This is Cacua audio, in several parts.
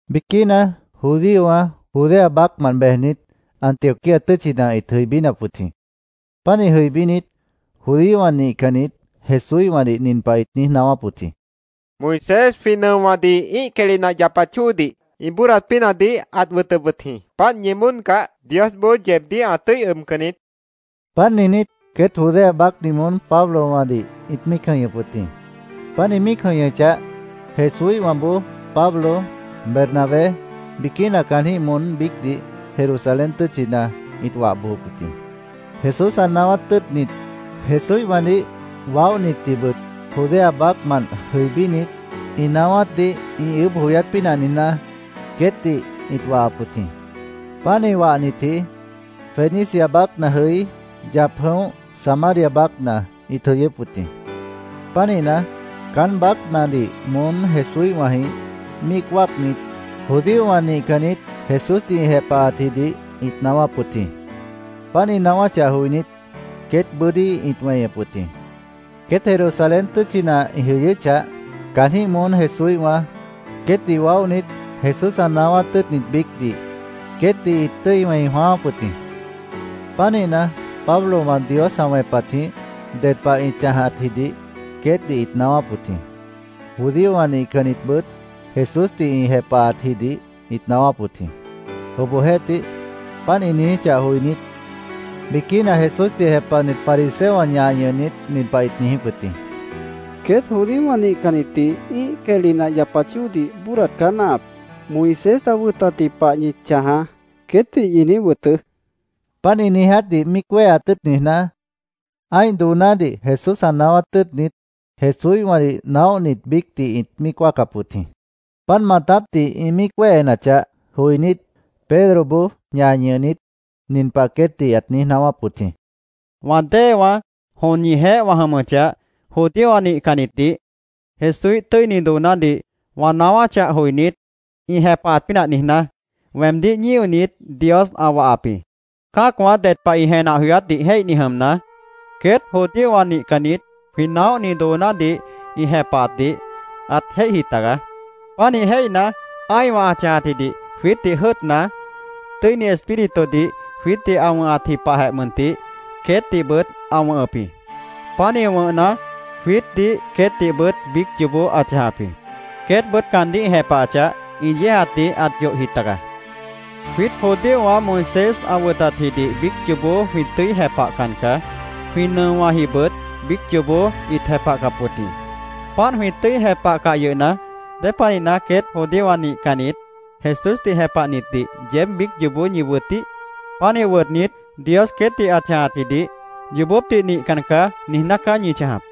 Biquína judíowã Judea baácmant bejnit, Antioquía tʉ́tchina ĩt jʉibínap wʉt jĩ. Pánih jʉibínit, judíowã nihcannit Jesúíhwãdih nin pah ĩt niíj naáwáp wʉt jĩ: “Moisés jwĩ nʉowãdih ĩ́ih quehli nah yapat chóodih ĩ bóodat pínahdih ãt wʉtʉp wʉt jĩ. Páant ñi bóodcah, Diosboó yeebdíh ã tʉ́i ʉbcan niít”, ĩt niijíp wʉt jĩ. Páant niijnít, queét Judea baácdih moón Pablowãdih ĩt míic jʉ̃ihñʉp wʉt jĩ. Páant ĩ míic jʉ̃ihñʉchah, Jesúíhwãboó Pablo, Bernabé, biquína caanjĩ́h moón biícdih Jerusalén tʉ́tchina ĩt wah bojop wʉt jĩ. Jesús ã naáwát tʉ́ʉtnit, Jesúíhwãdih waóhnitdihbʉt Judea baácmant jʉibínit ĩ naáwátdih ĩ ʉʉ́bh joyát pínah niijná, queétdih ĩt wahap wʉt jĩ. Páant ĩ wahnitji Fenicia baácna jʉí, yap jʉ̃óh, Samaria baácna ĩt jʉyʉ́p wʉt jĩ. Pánihna, caán baácnadih moón Jesúíhwãjĩh míic wáacnit, judíowã nihcannit Jesúsdih ĩ jepahatjidih ĩt naáwáp wʉt jĩ. Páant ĩ naáwáchah joinít, queét bʉ́dí ĩt weñep wʉt jĩ. Queét Jerusalén tʉ́tchina ĩ jʉyʉ́chah, caanjĩ́h moón Jesúíhwã, queétdih waóhnit, Jesús ã naáwát tʉ́ʉtnit biícdih, queétdih ĩt tʉ́i wẽi jwãááp wʉt jĩ. Pánihna, Pablowã Dios ã wẽpatjĩh ded pah ĩ chãjatjidih queétdih ĩt naáwáp wʉt jĩ. Judíowã nihcannitbʉt Jesúsdih ĩ jepahatjidih ĩt naáwáp wʉt jĩ. Obohjeéhtih, páant ĩ niijíchah joinít, biquína Jesúsdih jepahnit fariseowã ñah ñʉhnit, nin pah ĩt niijíp wʉt jĩ: —Queét judíowã nihcannitdih ĩ́ih quehli nah yapat chóodih bóodat caá náahap. ‘Moisés ã wʉtatji pah ñi chãjaá’, queétdih ñi niíj wʉtʉʉ́, ĩt niijíp wʉt jĩ. Páant ĩ niijátdih míic wéheat tʉ́ʉt niijná, ã́ih doonádih Jesús ã naáwát tʉ́ʉtnit, Jesúíhwãdih waóhnit biícdih ĩt míic wáacap wʉt jĩ. Páant maatápdih ĩ míic wéhenachah, joinít, Pedroboó ñah ñʉhnit, nin pah queétdih ãt niíj naáwáp wʉt jĩ: —Wã déewãá, jon ñijeéh wã jʉmʉchah, judíowã nihcannitdih Jesúíh tʉ́ini doonádih wã naáwáchah joinít, ĩ jepahat pínah niijná, weemdíh ñíonit, Dios ã wahap jĩ. Cã́acwã ded pah ĩ jenah joyátdih jéihni jʉmna, queét judíowã nihcannit jwĩ naóhni doonádih ĩ jepahatdih ãt jéihji tagaá. Pánih jéihna, ã́ihwã ã chãjatjidih jwiítdih jʉ́ʉtna, Tʉ́ini Espíritudih jwiítdih ã wʉ̃hatji pahjeh mʉntih, queétdihbʉt ã wʉ̃hʉp jĩ. Pánih wʉ̃hna, jwiítdih queétdihbʉt biíc yoobó ã chãjap jĩ. Queétbʉt caandíh ĩ jepahachah, ĩ yéejatdih ãt yohji taga. Jwiít judíowã Moisés ã wʉtatjidih biíc yoobó jwĩ tʉ́i jepahcan caá. Jwĩ nʉowãjibʉt biíc yoobó ĩt jepahcap wʉt jĩ. Páant jwĩ tʉ́i jepahcah yʉhna, ¿dépanihna queét judíowã nihcannit Jesúsdih jepahnitdih yeéb biíc yoobó ñi wʉtíh? Pánih wʉtnit, Dios queétdih ã chãjatjidih ‘Yoobópdih nihcan caá’, niijná caá ñi chãjap.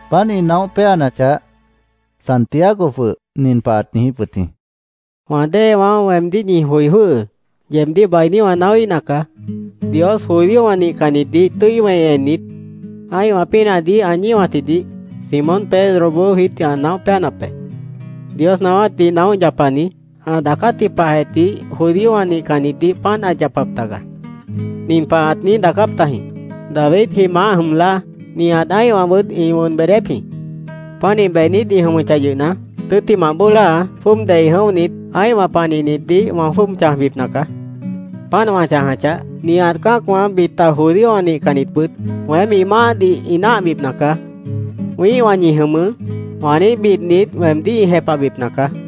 Páant ĩ naóh péanachah, Santiago jwʉh nin pah ãt niijíp wʉt jĩ: —Wã déewãá, weemdíh ñi joi jwʉ́hʉʉ́. Yeebdíh bainí wã naáwíhna caá. Dios judíowã nihcannitdih tʉ́i wẽi ennit, ã́ihwã pínahdih ã ñíwatjidih Simón Pedroboó jwiítdih ã naóh péanap be. Dios naáwátdih naóh yapani, ã daacátji pahjeh tih judíowã nihcannitdih páant ãt yapap taga. Nin pah ãt niíj daacáp tajĩ: ‘ “Davidji maáh jʉm láa, nihat ã́ihwãbʉt ĩ wʉn beedép jĩ. Pánih beednít ĩ jʉmʉchah yʉhna, tʉ́ttimah bóo láa, jwʉ́ʉb dei jʉ̃óhnit, ã́ihwã panihnitdih wã jwʉ́ʉb chãjbipna caá. Páant wã chãjachah, nihat cã́acwã bita judíowã nihcannitbʉt weém ĩ Maáhdih ĩ náahbipna caá. ‘Wĩ́ihwã ñi jʉmʉʉ́’, wã niíj bidnit weemdíh ĩ jepahbipna caá”,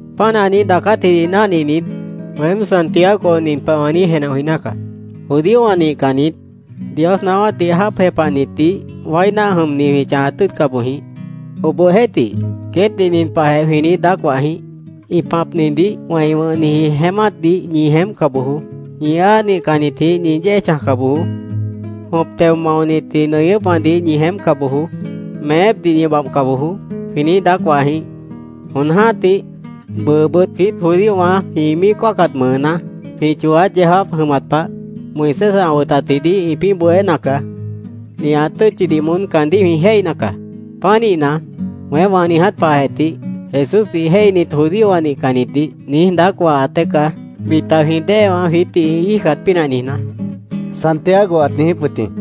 “Páant ã niíj daacátjidih náhninit, weém, Santiago nin pah wã niíj jenah joiná caá: Judíowã nihcannit, Dios naáwátdih jáap jepahnitdih wái náah jʉmni jwĩ chãjat tʉ́ʉtca boj jĩíh. Obohjeéhtih, queétdih nin pahjeh jwĩ niíj daác wah jĩíh: ‘Ĩ pãpnidih wẽi wʉ̃hniji jeémátdih ñi jeémpca bojoó. Ñi áa nihcannitjĩh ñi yéej chãjca bojoó. Jõp teo maonitji nʉñʉ́pwãdih ñi jeémpca bojoó. Meépdih ñi babhca bojoó’, jwĩ niíj daác wah jĩíh. Jon jã́tih, bʉʉbʉt jwiít judíowã jwĩ míic wáacat mʉʉná, jwĩ chooát yeó jáap jʉmat pah, Moisés ã wʉtatjidih ĩpĩ́ bohéna caá. Nihat tʉ́tchidih moón caandíh jwĩ jéihna caá. Pánihna, weém wã niiját pahjeh tih Jesúsdih jéihnit judíowã nihcannitdih, niíj daác wahat dée caá, bita jwĩ déewã jwiítdih ĩ íijcat pínah niijná”, Santiago ãt niijíp wʉt jĩ.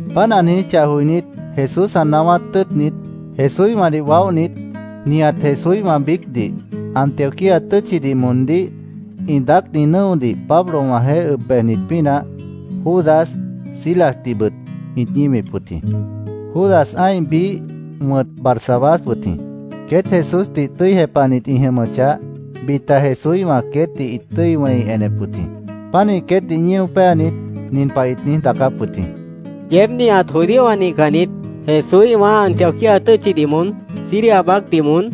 Páant ã niijíchah joinít, Jesús ã naáwát tʉ́ʉtnit, Jesúíhwãdih waóhnit, nihat Jesúíhwã biícdih, Antioquía tʉ́tchidih moondíh ĩ daácni nʉ́odih Pablowãjeéh ʉb bejnit pínah, Judas, Silasdihbʉt ĩt ñíwip wʉt jĩ. Judas ã́ih biíh wʉ̃t Barsabás wʉt jĩ. Queét Jesúsdih tʉ́i jepahnit ĩ jʉmʉchah, bita Jesúíhwã queétdih ĩt tʉ́i wẽi enep wʉt jĩ. Pánih queétdih ñío péanit, nin pah ĩt niíj daacáp wʉt jĩ: “Yeéb nihat judíowã nihcannit Jesúíhwã Antioquía tʉ́tchidih moón, Siria baácdih moón,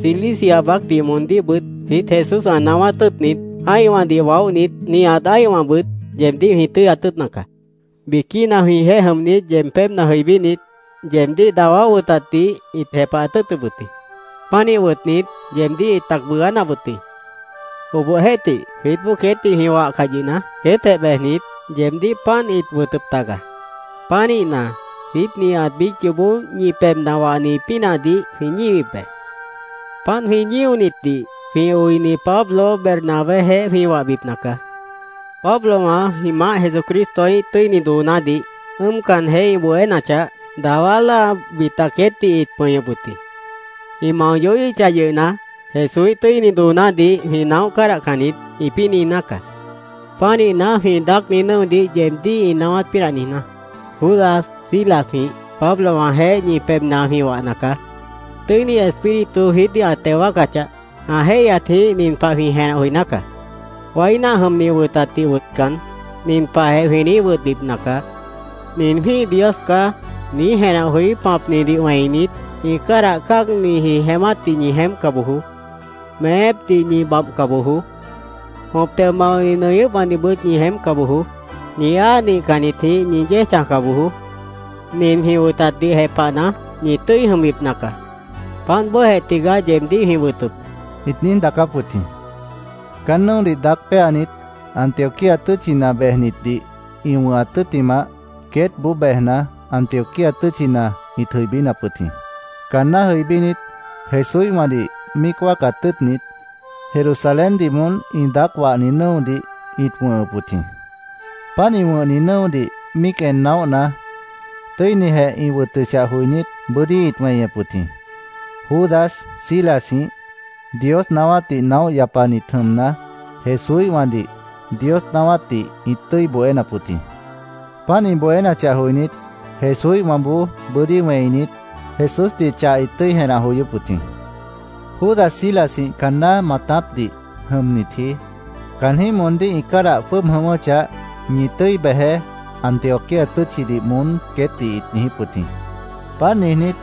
Cilicia baácdih moondíhbʉt jwiít Jesús ã naáwát tʉ́ʉtnit, ã́ihwãdih waóhnit, nihat ã́ihwãbʉt, yeebdíh jwĩ tʉ́yat tʉ́ʉtna caá. Biquína jwĩjeéh jʉmnit yeeb pébhna jʉibínit, yeebdíh dawá wʉtatdih ĩt jepahat tʉ́ʉtʉp wʉt jĩ. Pánih wʉtnit, yeebdíh ĩt tac bʉʉgánap wʉt jĩ. Obohjeéhtih, jwiítboó queétdih jwĩ wahcah yʉhna, queétjeh bejnit, yeebdíh páant ĩt wʉtʉp taga. Pánihna, jwiít nihat biíc yoobó ñi pebhna wahni pínahdih jwĩ ñíwip be. Páant jwĩ ñíonitdih jwĩ oini Pablo Bernabéjeéh jwĩ wahbipna caá. Pablowã jwĩ Maáh Jesucristoíh tʉ́ini doonádih ʉ́ʉmcanjeh ĩ bohénachah, dawá láa bita queétdih ĩt pʉñʉp wʉt jĩ. ‘Ĩ mao yohíhichah yʉhna, Jesúíh tʉ́ini doonádih jwĩ naóh cádahcan niít’, ĩpĩ́ niijná caá. Pánihna, jwĩ daácni nʉ́odih yeebdíh ĩ naáwát pínah niijná, Judas, Silasjĩh Pablowãjeéh ñi pebhna jwĩ wahna caá. Tʉ́ini Espíritu jwiítdih ã teo wáacachah, ã jéihyatjĩh nin pah jwĩ jenah joiná caá: Wái náah jʉmni wʉtatdih wʉtcan, nin pahjeh jwĩ niíj wʉtbipna caá: ‘Nin jwĩ́ih dios caá’, niíj jenah joí pãpnidih wẽinit, ĩ cádah cáagniji jeémátdih ñi jeémpca bojoó. Meépdih ñi babhca bojoó. Jõp teo maoni nʉñʉ́pwãdihbʉt ñi jeémpca bojoó. Ñi áa nihcannitjĩh ñi yéej chãjca bojoó. Nin jwĩ wʉtatdih jepahna, ñi tʉ́i jʉmbipna caá. Páant bóojeh tigaá yeebdíh jwĩ wʉtʉp”, ĩt niíj daacáp wʉt jĩ. Caán nʉ́odih daác péanit, Antioquía tʉ́tchina bejnitdih ĩ wʉ̃hat tʉ́ttimah, queétboó bejna, Antioquía tʉ́tchina ĩt jʉibínap wʉt jĩ. Caanná jʉibínit, Jesúíhwãdih míic wáacat tʉ́ʉtnit, Jerusaléndih moón ĩ daác wahni nʉ́odih ĩt wʉ̃hʉp wʉt jĩ. Páant ĩ wʉ̃hni nʉ́odih míic en naóhna, tʉ́inijeh ĩ wʉtʉchah joinít, bʉ́dí ĩt weñep wʉt jĩ. Judas Silasjĩh Dios naáwátdih naóh yapanit jʉmna, Jesúíhwãdih Dios naáwátdih ĩt tʉ́i bohénap wʉt jĩ. Páant ĩ bohénachah joinít, Jesúíhwãboó bʉ́dí wẽinit, Jesúsdih chah ĩt tʉ́i jenah joyóp wʉt jĩ. Judas Silasjĩh caanná maatápdih jʉmnitji caanjĩ́h moondíh ĩ cádah jwʉ́ʉb jʉ̃ʉ́wʉ́chah, “Ñi tʉ́i bejeé”, Antioquía tʉ́tchidih moón queétdih ĩt niijíp wʉt jĩ. Páant niijnít,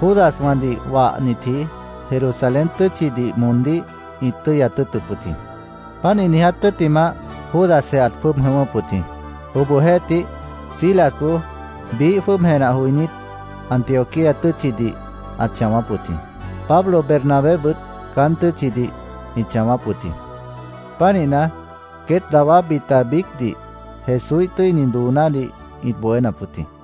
Judaswãdih wahnitji Jerusalén tʉ́tchidih moondíh ĩt tʉ́yat tʉ́ʉtʉp wʉt jĩ. Páant ĩ niiját tʉ́ttimah, Judasjeh ãt jwʉ́ʉb jʉ̃ʉ́wʉ́p wʉt jĩ. Obohjeéhtih, Silasboó biíh jwʉ́ʉb jenah joinít, Antioquía tʉ́tchidih ãt chãwáp wʉt jĩ. Pablo Bernabébʉt caán tʉ́tchidih ĩt chãwáp wʉt jĩ. Pánihna, queét, dawá bita biícdih Jesúíh tʉ́ini doonádih ĩt bohénap wʉt jĩ.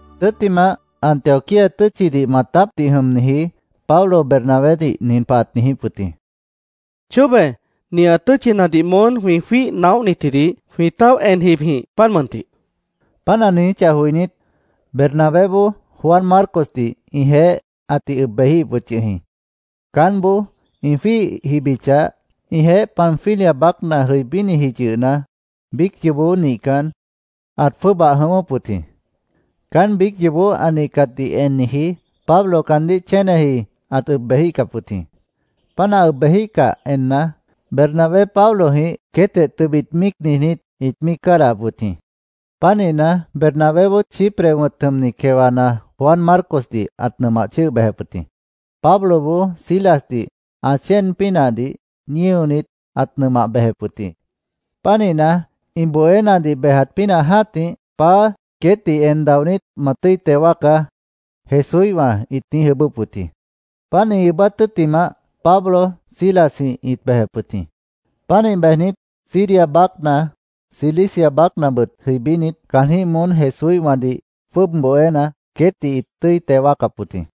Tʉ́ttimah, Antioquía tʉ́tchidih maatápdih jʉmniji Pablo Bernabédih nin pah ãt niijíp wʉt jĩ: —Chóbe, nihat tʉ́tchinadih moón jwĩ jwíih naóhnitjidih jwĩ táoh en jibjĩh, páant mʉntih, ãt niijíp wʉt jĩ. Páant ã niijíchah joinít, Bernabéboó Juan Marcosdih ĩjeéh ãtih ʉb bejíhip wʉt yʉh jĩ. Caánboó ĩ jwíih jibichah, ĩjeéh Panfilia baácna jʉibíniji yʉhna, biíc yoobó nihcan, ãt jwʉ́ʉbah jʉ̃ʉ́wʉ́p wʉt jĩ. Caán biíc yoobó ã nihcatdih enniji, Pablo caandíh chéneji ãt ʉb bejíhcap wʉt jĩ. Páant ã ʉb bejíhcah enna, Bernabé Pablojĩh queétjeh tʉbit míic niijnít, ĩt míic cádahap wʉt jĩ. Pánihna, Bernabéboó Chipre wʉ̃t jʉmni quewana Juan Marcosdih ãt nʉmah chʉ́ʉh bejep wʉt jĩ. Pabloboó Silasdih ã chéen pínahdih ñíonit, ãt nʉmah bejep wʉt jĩ. Pánihna, ĩ bohénadih bejat pínah jã́tih, “Paá, queétdih en daonít, ma tʉ́i teo wáacá”, Jesúíhwã ĩt niíj ʉʉ́bʉ́p wʉt jĩ. Páant ĩ ʉʉ́bát tʉ́ttimah, Pablo Silasjĩh ĩt bejep wʉt jĩ. Pánih bejnit, Siria baácna Cilicia baácnabʉt jʉibínit, caanjĩ́h moón Jesúíhwãdih jwʉ́ʉb bohéna, queétdih ĩt tʉ́i teo wáacap wʉt jĩ.